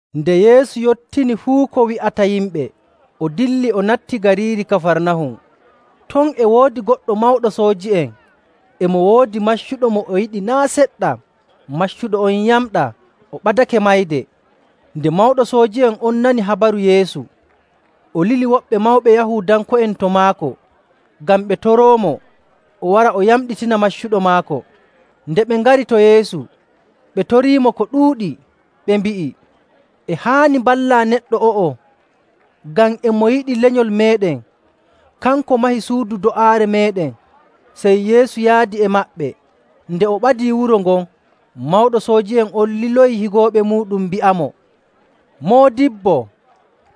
Nde Yeesu yottini fuu ko wi'ata yimɓe, o dilli o natti gariiri Kafarnahum. Ton e woodi goɗɗo mawɗo sooji'en e mo woodi maccuɗo mo o yiɗi naa' seɗɗa. Maccuɗo on yamɗaa, o ɓadake mayde. Nde mawɗo sooji'en on nani habaru Yeesu, o lili woɓɓe mawɓe Yahuudanko'en to maako ngam ɓe toroomo o wara o yamɗitina maccuɗo maako. Nde ɓe ngari to Yeesu, ɓe toriimo ko ɗuuɗi, ɓe mbi'i, “E haani mballaa neɗɗo o'o, ngam e mo yiɗi lenyol meeɗen, kanko mahi suudu do'aare meeɗen.” Sey Yeesu yaadi e maɓɓe. Nde o ɓadii wuro ngon, mawɗo sooji'en on liloyi higooɓe muuɗum mbi'amo, “Moodibbo,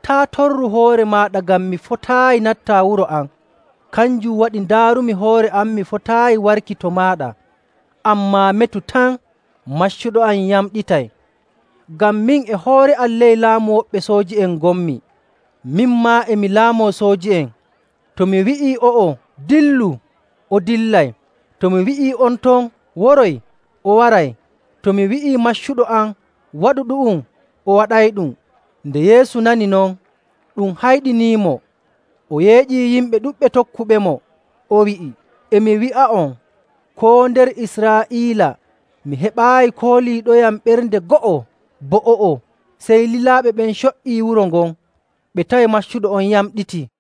taa' torru hoore maaɗa ngam mi fotaayi nattaa wuro am. Kanjum waɗi ndaarumi hoore am mi fotaayi warki to maaɗa, ammaa metu tan, maccuɗo am yamɗitay. Ngam min e hoore am ley laamu woɓɓe sooji'en ngonmi, min maa, e mi laamoo sooji'en. To mi wi'ii o'o, ‘Dillu!’ o dillay. To mi wi'ii on ton, ‘Woroy!’ o waray. To mi wi'ii maccuɗo am, ‘Waɗu ɗu'um!’ o waɗayɗum.” Nde Yeesu nani non, ɗum hayɗiniimo, o yeeƴii yimɓe ɗuɗɓe tokkuɓemo, o wi'i, “E mi wi'a'on, koo nder Israa'iila mi heɓaayi kooliiɗoyam ɓernde go'o bo o'o!” Sey lilaaɓe ɓen co''ii wuro ngon, ɓe tawi maccuɗo on yamɗitii.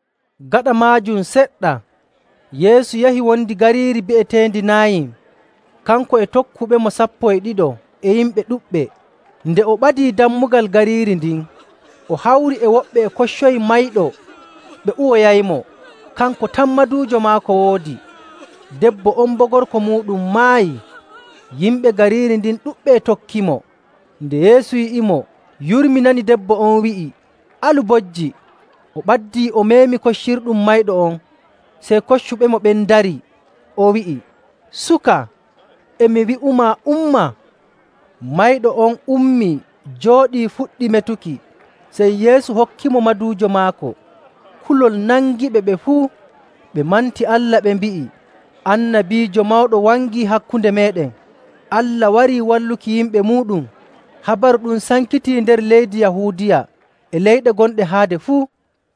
Gaɗa maajum seɗɗa, Yeesu yahi wondi gariiri bi'eteendi Naayin, kanko e tokkuɓemo sappo e ɗiɗo e yimɓe ɗuɗɓe. Nde o ɓadii dammugal gariiri ndin, o hawri e woɓɓe e koccoyi mayɗo ɓe uwoyaymo, kanko tan maduujo maako woodi. Debbo on boo gorko muuɗum maayi, yimɓe gariiri ndin ɗuɗɓe e tokkimo. Nde Yeesu yi'imo, yurminani debbo on, wi'i, “Alu bojji.” O ɓaddii, o meemi koccirɗum mayɗo on. Sey koccuɓemo ɓen ndarii. O wi'i, “Suka, e mi wi'umaa, umma.” Mayɗo on ummii, jooɗii, fuɗɗi metuki. Sey Yeesu hokkitimo maduujo maako. Kulol nangiɓe ɓe fuu, ɓe manti Allah, ɓe mbi'i, “Annabiijo mawɗo wangii hakkunde meeɗen! Allah warii walluki yimɓe muuɗum!” Habaru ɗum sankitii nder leydi Yahuudiya e leyɗe gonɗe haade fuu.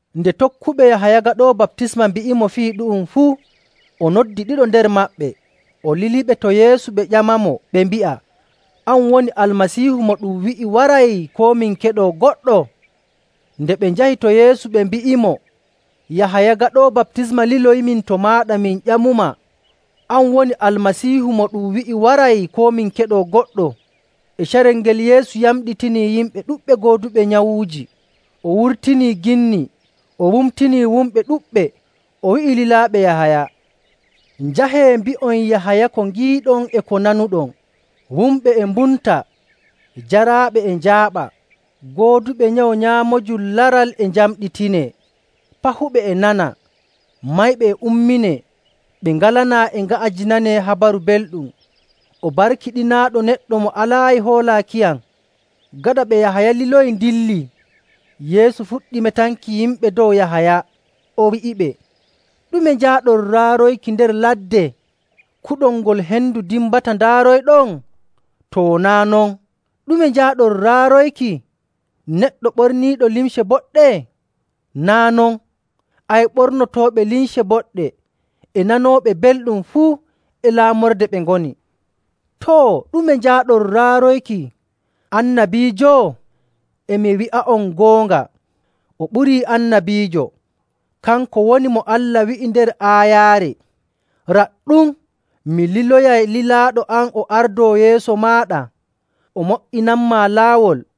Nde tokkuɓe Yahaya Gaɗoowo Baptisma mbi'imo fii ɗu'um fuu, o noddi ɗiɗo nder maɓɓe. O liliɓe to Yeesu ɓe ƴamamo, ɓe mbi'a, “An woni Almasiihu mo ɗum wi'i waray, koo min keɗoo goɗɗo?” Nde ɓe njahi to Yeesu, ɓe mbi'imo, “Yahaya Gaɗoowo Baptisma liloyiimin to maaɗa min ƴamumaa, ‘An woni Almasiihu mo ɗum wi'i waray, koo min keɗoo goɗɗo?’” E carel ngel Yeesu yamɗitinii yimɓe ɗuɗɓe gooduɓe nyawuuji, o wurtinii ginni, o wumtinii wumɓe ɗuɗɓe. O wi'i lilaaɓe Yahaya, “Njahee, mbi'on Yahaya ko ngiiɗon e ko nanuɗon: wumɓe e mbumta, jaraaɓe e njaaɓa, gooduɓe nyawu nyaamoojum laral e njamɗitinee, pahuɓe e nana, mayɓe e umminee, ɓe ngalanaa e nga'ajinanee Habaru Belɗum.. O barkiɗinaaɗo neɗɗo mo alaayi hoolaakiyam.” Gaɗa ɓe Yahaya liloyi ndillii, Yeesu fuɗɗi metanki yimɓe dow Yahaya, o wi'iɓe, “Ɗume njaaɗon raaroyki nder ladde? Kuɗol ngol hendu dimbata ndaaroyɗon? To naa' non, ɗume njaaɗon raaroyki? Neɗɗo ɓorniiɗo limce boɗɗe? Naa' non, ay ɓornotooɓe limce boɗɗe e nanooɓe belɗum fuu e laamorde ɓe ngoni. Too, ɗume njaaɗon raaroyki? Annabiijo? E mi wi'a'on goonga, o ɓurii annabiijo. Kanko woni mo Allah wi'i nder aayaare, ‘Raɗɗum, mi liloyay lilaaɗo am o ardoo yeeso maaɗa, o mo''inanmaa laawol.’.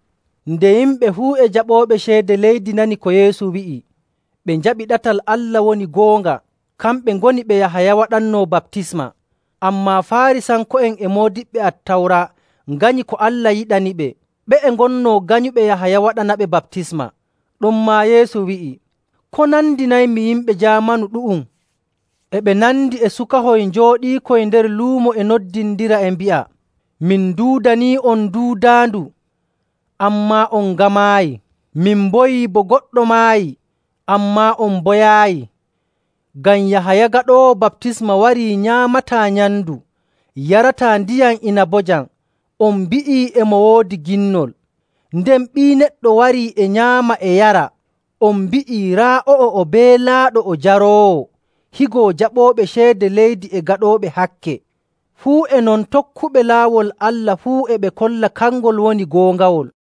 Nde yimɓe fuu e jaɓooɓe ceede leydi nani ko Yeesu wi'i, ɓe njaɓi ɗatal Allah woni goonga. Kamɓe ngoni ɓe Yahaya waɗannoo baptisma. Ammaa Faarisanko'en e moodiɓɓe Attawra nganyi ko Allah yiɗaniɓe. Ɓe'e ngonnoo nganyuɓe Yahaya waɗanaɓe baptisma.. Ɗonmaa Yeesu wi'i, “Ko nandinaymi yimɓe jaamanu ɗu'um? E ɓe nandi e sukahoy njooɗiikoy nder luumo e noddindira e mbi'a, ‘Min nduudanii'on duudaandu, ammaa on ngamaayi. Min mboyi bo goɗɗo maayi, ammaa on mboyaayi.’ Ngam Yahaya Gaɗoowo Baptisma warii nyaamataa nyamndu yarataa ndiyam inabojam, on mbi'ii, ‘E mo woodi ginnol.’ Nden Ɓii Neɗɗo warii e nyaama e yara, on mbi'ii, ‘Raa o'o, o beelaaɗo o jaroowo, higo jaɓooɓe ceede leydi e gaɗooɓe hakke.’ Fuu e non, tokkuɓe laawol Allah fuu e ɓe kolla kangol woni goongawol.”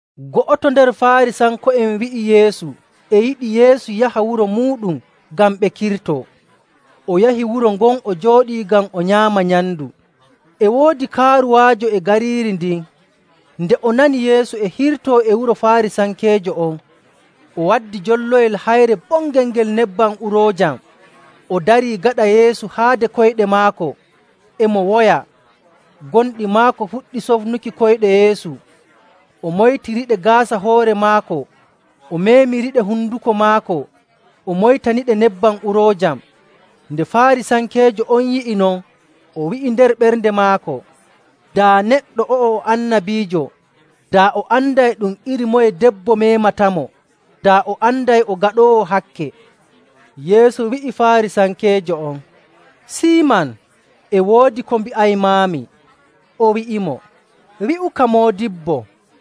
Go'oto nder Faarisanko'en wi'i Yeesu e yiɗi Yeesu yaha wuro muuɗum ngam ɓe kirtoo. O yahi wuro ngon o jooɗii ngam o nyaama nyamndu. E woodi kaaruwaajo e gariiri ndin, nde o nani Yeesu e hirtoo e wuro Faarisankeejo on, o waddi jolloyel hayre bongel ngel nebbam uroojam. O darii gaɗa Yeesu haade koyɗe maako, e mo woya, gonɗi maako fuɗɗi sofnuki koyɗe Yeesu, o moytiriɗe gaasa hoore maako o meemiriɗe honduko maako o moytaniɗe nebbam uroojam.. Nde Faarisankeejo on yi'i non, o wi'i nder ɓernde maako, “Daa neɗɗo o'o o annabiijo, daa o anday ɗum iri moye debbo meematamo, daa o anday o gaɗoowo hakke.” Yeesu wi'i Faarisankeejo on, “Siiman, e woodi ko mbi'aymaami.” O wi'imo, “Wi'uka moodibbo!”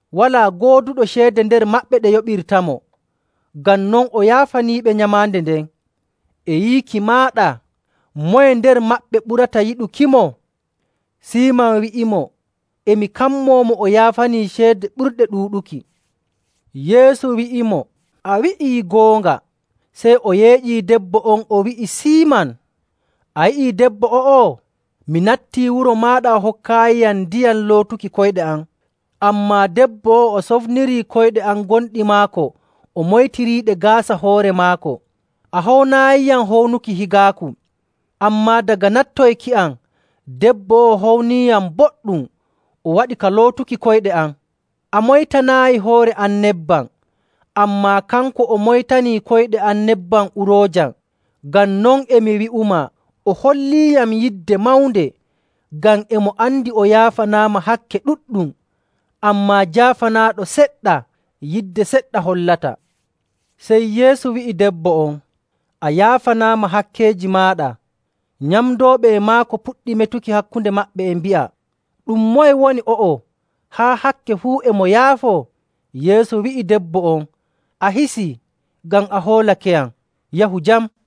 Walaa gooduɗo ceede nder maɓɓe ɗe yoɓirtamo, ngam non o yaafaniiɓe nyamaande nden. E yiiki maaɗa, moye nder maɓɓe ɓurata yiɗukimo?” Siiman wi'imo, “E mi kammoo mo o yaafanii ceede ɓurɗe ɗuuɗuki.” Yeesu wi'imo, “A wi'ii goonga.” Sey o yeeƴii debbo on o wi'i Siiman, “A yi'i debbo o'o? Mi nattii wuro maaɗa, a hokkaayiyam ndiyam lootumi koyɗe am. Ammaa debbo o'o o sofnirii koyɗe am gonɗi maako o moytiriiɗe gaasa hoore maako. A hownaayiyam hownuki higaaku, ammaa daga nattoyki am debbo o'o howniyam boɗɗum, o waɗi ka lootuki koyɗe am. A moytanaayi hoore am nebbam, ammaa kanko o moytanii koyɗe am nebbam uroojam. Ngam non e mi wi'umaa, o holliiyam yidde mawnde ngam e mo andi o yaafanaama hakke ɗuɗɗum. Ammaa jaafanaaɗo seɗɗa, yidde seɗɗa hollata.” Sey Yeesu wi'i debbo on, “A yaafanaama hakkeeji maaɗa.” Nyamdooɓe e maako puɗɗi metuki hakkunde maɓɓe, e mbi'a, “Ɗum moye woni o'o, haa hakke fuu e mo yaafo?” Yeesu wi'i debbo on, “A hisii: Waato yaafanaama. ngam a hoolakeyam, yahu jam.”